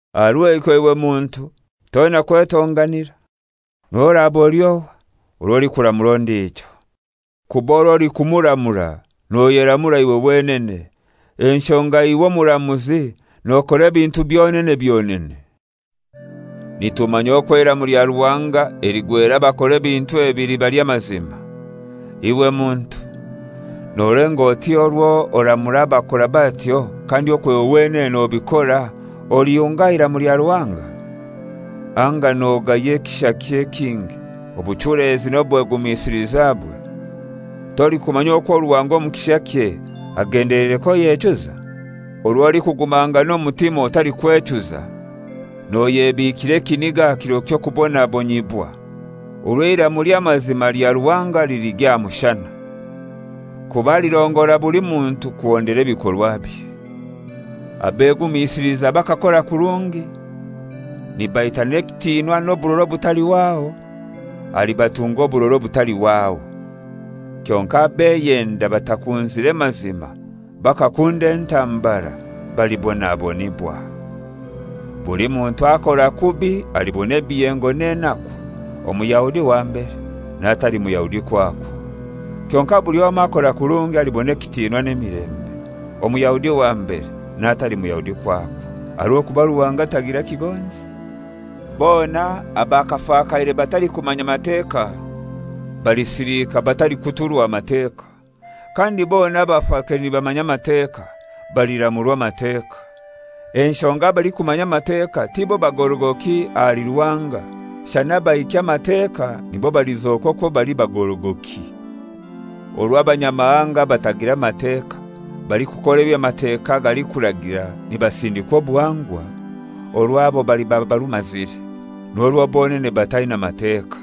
Aha rw'ekyo iwe muntu toina kwetonganira, n'orwo oraba oli ohai, orwo olikuramura ondijo. Kuba orw'olikumuramura noyeramura iwe wenene, enshonga iwe omuramuzi, nokora ebintu byonene byonene. Nitumanya okwo eiramu lya Ruhanga eligwera abakora ebintu ebi liba ly'amazima. Iwe muntu, nolenga oti orwo oramura abakora batyo kandi okwo iwe wenene nobikora, olihunga aha iramu lya Ruhanga? Anga nogaya ekishakye ekingi, obuchulezi n'obwegumisilizabwe? Tolikumanya okwo Ruhanga omu kishakye agendeleire k'oyechuza? Orwo olikugumangana omutima otalikwechuza noyebiikira ekiniga aha kiro ky'okubonabonyibwa orwo eiramu ly'amazima lya Ruhanga liligya aha mushana. Kuba alirongora buli muntu kuhondera ebikorwabye: abegumisiliza bakakora kurungi, nibaitanira ekitinwa n'oburora obutalihwaho, alibatunga oburora obutalihwaho. Kyonkai abeyenda batakunzire mazima, bakakunda entambara, balibonabonibwa. Buli muntu akora kubi alibona ebiyengo n'enaku, Omuyahudi wa mbere, n'atali Muyahudi kwakwo, kyonkai buli omoi akora kurungi alibona ekitinwa n'emilembe, Omuyahudi wa mbere, n'atali Muyahudi kwakwo. Aha rw'okuba Ruhanga tagira kigonzi. Bona abaakafakaire batalikumanya Mateka balisilika batalikuturwa Mateka, kandi bona abaakafakaire nibamanya Amateka baliramurwa Amateka. Enshonga abalikumanya Amateka tibo bagorogoki ahali Ruhanga, shana abahikya Amateka nibo balizoka okwo bali bagorogoki. Orwo Abanyamahanga abatagira Mateka balikukora eby'Amateka galikuragira nibasindikwa obuhangwa, orwabo baliba barumazire, n'orwo bonene bataina Mateka.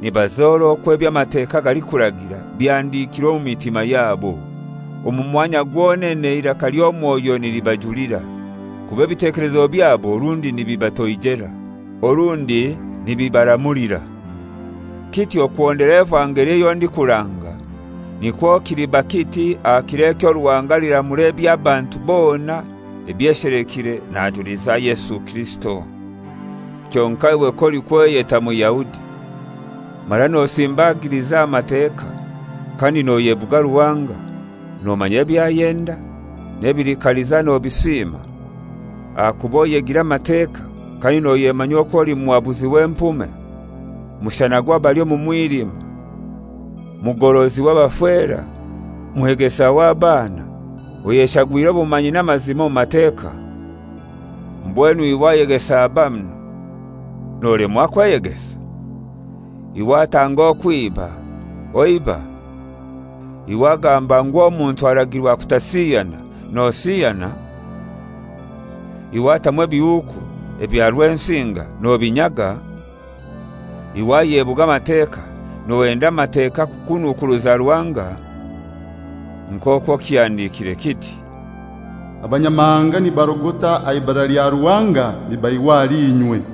Nibazora okwo eby'Amateka galikuragira bihandikirwe omu mitima yabo, omu mwanya gwonene eiraka ly'omwoyo nilibajulira, kuba ebitekelezo byabo orundi nibibatoijera, orundi nibibaramulira. Kityo kuhondera evangeli eyo ndikuranga, nikwo kiliba kiti aha kiro ekyo Ruhanga aliramura eby'abantu bona ebyeshelekire najuliza Yesu Kirisito. Kyonkai iwe k'olikweyeta Muyahudi mara nosimbagiliza aha Mateka kandi noyebuga Ruhanga, nomanya eby'ayenda, n'ebili kaliza nobisiima, ahakuba oyegire Amateka, kandi noyemanya okwo oli muhabuzi w'empume, mushana gw'abali omu mwilima, mugorozi w'abafera, mwegesa w'abaana, oyeshagwire obumanyi n'amazima omu Mateka, mbwenu iwe ayegesa banu, nolemwa kweyegesa? Iwe atanga okwiba, oiba? Iwe agamba ngu omuntu aragirwa kutasiyana, nosiyana? Iwe atamwa ebihuuku, ebya Rwensinga nobinyaga? Iwe ayebuga Amateka, nohenda Amateka kukunukuruza Ruhanga? Nk'okwo kihandikiire kiti, «Abanyamahanga nibarogota aha ibara lya Ruhanga nibaihwa ahali inywe.»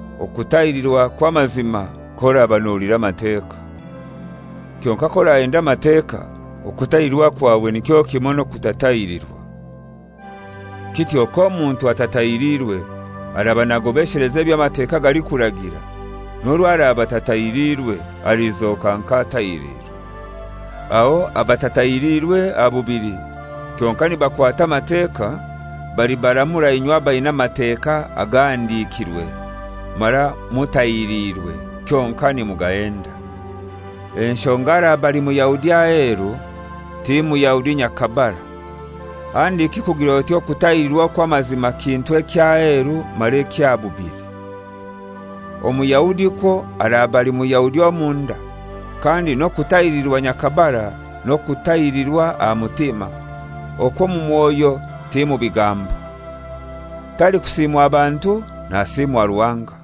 Okutahirirwa kw'amazima k'oraba nohulira Amateka; kyonkai k'orahenda Amateka, okutahirirwa kwawe nikyo kimoi n'okutatahilirwa. Kityo k'omuntu atatahirirwe araba nagobesheleza eby'Amateka galikuragira, n'orwo araba atatahirirwe alizoka nk'atahiriirwe. Aho abatatahiliirwe aha bubili kyonkai nibakwata Amateka, balibaramura inywe abaina Amateka agahandikirwe mara mutahiriirwe kyonkai nimugahenda. Enshonga araba ali Muyahudi aheru ti Muyahudi nyakabara, handiki kugir'oti okutahirirwa okw'amazima kintu eky'aheru mara eky'aha bubili. Omuyahudi kwo araba ali Muyahudi omunda, kandi n'okutahirirwa nyakabara n'okutahirirwa aha mutima, okw'omu mwoyo ti mu bigambo. Talikusiimwa bantu, nasiimwa Ruhanga.